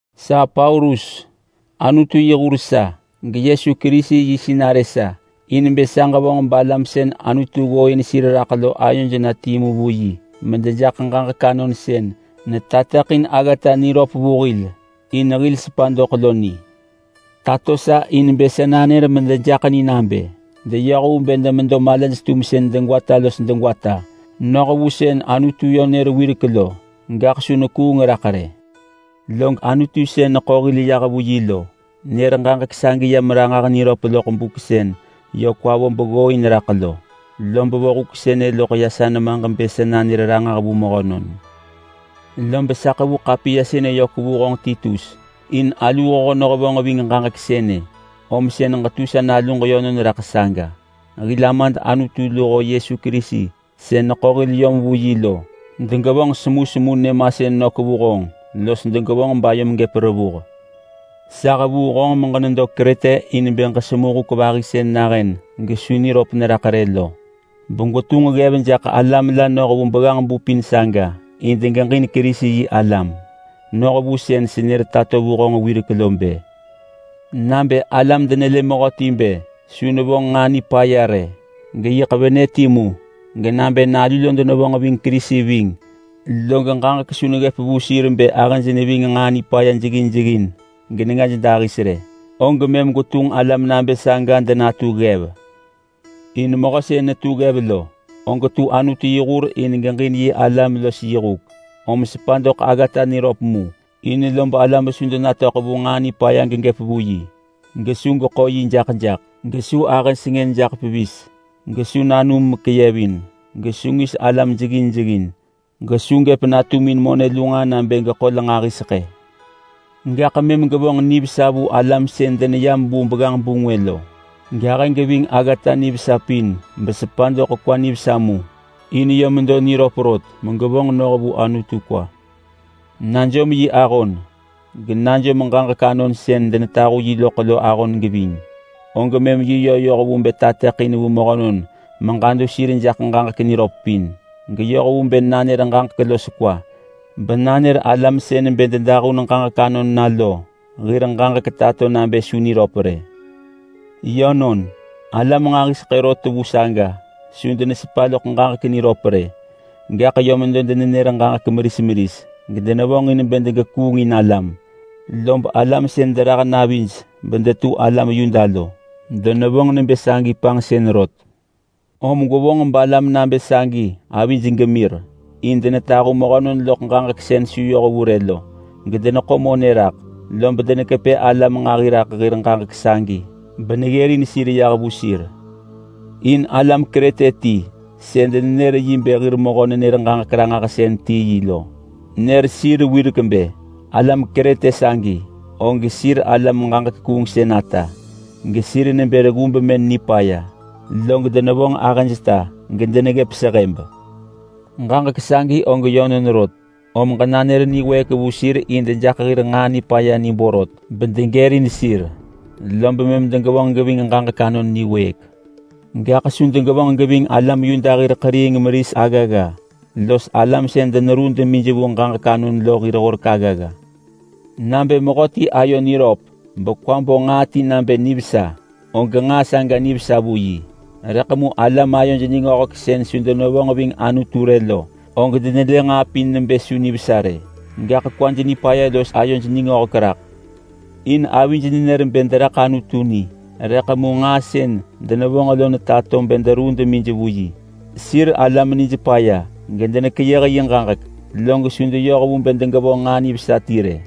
Sa Paulus, Anutu yi hur sa, geYesu Kerisi yi sinarë sa, in bë sa ġevonġ balam sën Anutu ggooin sir raḳ lo ayoj na timu vu yi medejaḳ ġaġek anon sën netateḳin aggata niröp vu hil in hil sepa doḳ lo ni. Tato sa in bë sa nanër medejaḳ ni nabë deyoh vu bë demedo malaj-tumsën degwata los degwata, noh vu sën Anutu nër yö wirek lo, gaḳ su nekuung raḳ rë. Log Anutu sën neḳo hil yah vu yi lo nër ġaġek sagi yam ranġah niröp loḳ buk sën yö kwa vo beggooin raḳ lo. Lob vo huk sënë loḳ sa nemaġ bë sa nanër ranġah vu mehönon. Lob sa ḳevu ḳapiya sënë yök vu honġ Titus in aluu hoho nehevonġ ving ġaġek sënë, om sën ġetu sa naluġ yönon raḳ saga. Hil Amad Anutu luho Yesu Kerisi sën neḳo hil yom vu yi lo degevonġ semusemu nyëmasën nök vu honġ los degevonġ bayom gëp revuh. Sa hevuu honġ meġenedo Krete in bë ġesemu huk vahi sën nahën gesu niröp neraḳ rë lo, begwetunġ ggev jaḳ alam la noh vu begganġ-bu pin saga in degeġin Kerisi-yi-alam. Noh vu sën senër tato vu honġ wirek lo bë: Nabë alam denelë mehöti bë su nevonġ nġaa nipaya rë, geyiḳ venë timu. Genabë nalu lo denevonġ ving Kerisi ving, log ġaġek su neggëp vu sir bë ahëj neving nġaa nipaya jeggin jeggin genengaj dahis rë, og mëm gwetunġ alam nabë saga denatu ggev. In mehö sën netu ggev lo, og tu Anutu yi hur in geġin yi alam los yi huk. Om sepa doḳ aggata niröp mu, in lob alam su denatöḳ vu nġaa nipaya gegëp vu yi. Gesu geḳo yi jaḳ jaḳ, gesu ahë sengën jaḳ pevis, gesu nanum mekeyevin, gesu ngis alam jeggin jeggin, gesu gëp natumin monë lu nġaa nabë gekol nġahiseḳë. Gaḳ mëm gevonġ nivesa vu alam sën deneyam vu begganġ-bu ngwë lo; gahë geving aggata nivesa pin besepa doḳ kwa nivesa mu, in bë medo niröp rot megevonġ noh vu Anutu kwa. Najom yi ahon, genajom ġaġek anon sën denetahu yi loḳ lo ahon geving. Og mëm yi yö yoh vu bë tateḳin vu mehönon meġadu sir jaḳ ġaġek niröp pin, geyoh vu bë nanër ġaġek los kwa, benanër alam sën bë dedahun ġaġek anon na lo hir ġaġek tato nabë su niröp rë. Yönon, alam nġahiseḳë rot vu saga su denesepa loḳ ġaġek niröp rë, gaḳ yö medo denenër ġaġek meris meris gedenevonġin bë degekuungin alam. Lob alam sën derah navij bedetu alam Yuda lo, denevonġ nebë sagi panġsën rot. Om gwevonġ balam nabë sagi avij gemir, in denetahu mehönon loḳ ġaġek sën su yoh vu rë lo gedeneḳo monë raḳ. Lob denekepë alam nġahi raḳ hir ġaġek sagi beneggërin sir yah vu sir. In alam Krete ti sën denër yi bë hir mehö-nenër-ġaġek-ranġahsën ti yi lo, nër sir wirek bë, “Alam Krete sagi, og sir alam ġaġek kuungsën ata, gesir nebë reggu bemën nipaya, log denevonġ ahëjta gedeneggëp sehëb.” Ġaġek sagi og yönon rot. Om ġenanër niwëëk vu sir in dejaḳ hir nġaa nipaya ni borot bedegërin sir, lob mëm degevonġ geving ġaġek anon niwëëk. Gaḳ su degevonġ geving alam Yuda hir ḳeriing meris aggagga los alam sën deneruu demij vu ġaġek anon lo hir horek aggagga. Nabë mehöti ayo niröp bekwa bo nġaa ti nabë nivesa, og nġaa saga nivesa vu yi. Rëḳ mu alam ayoj ningöhek sën su denevonġ ving Anutu rë lo, og denelë nġaa pin nebë su nivesa rë, gaḳ kwaj nipaya los ayoj ningöhek raḳ. In avij nenër bë deraḳ Anutu ni, rëḳ mu nġaa sën denevonġ lo netato bë deruu demij vu yi. Sir alam nij paya gedenekeyëh yi ġaġek, log su deyoh vu bë degevonġ nġaa nivesa ti rë.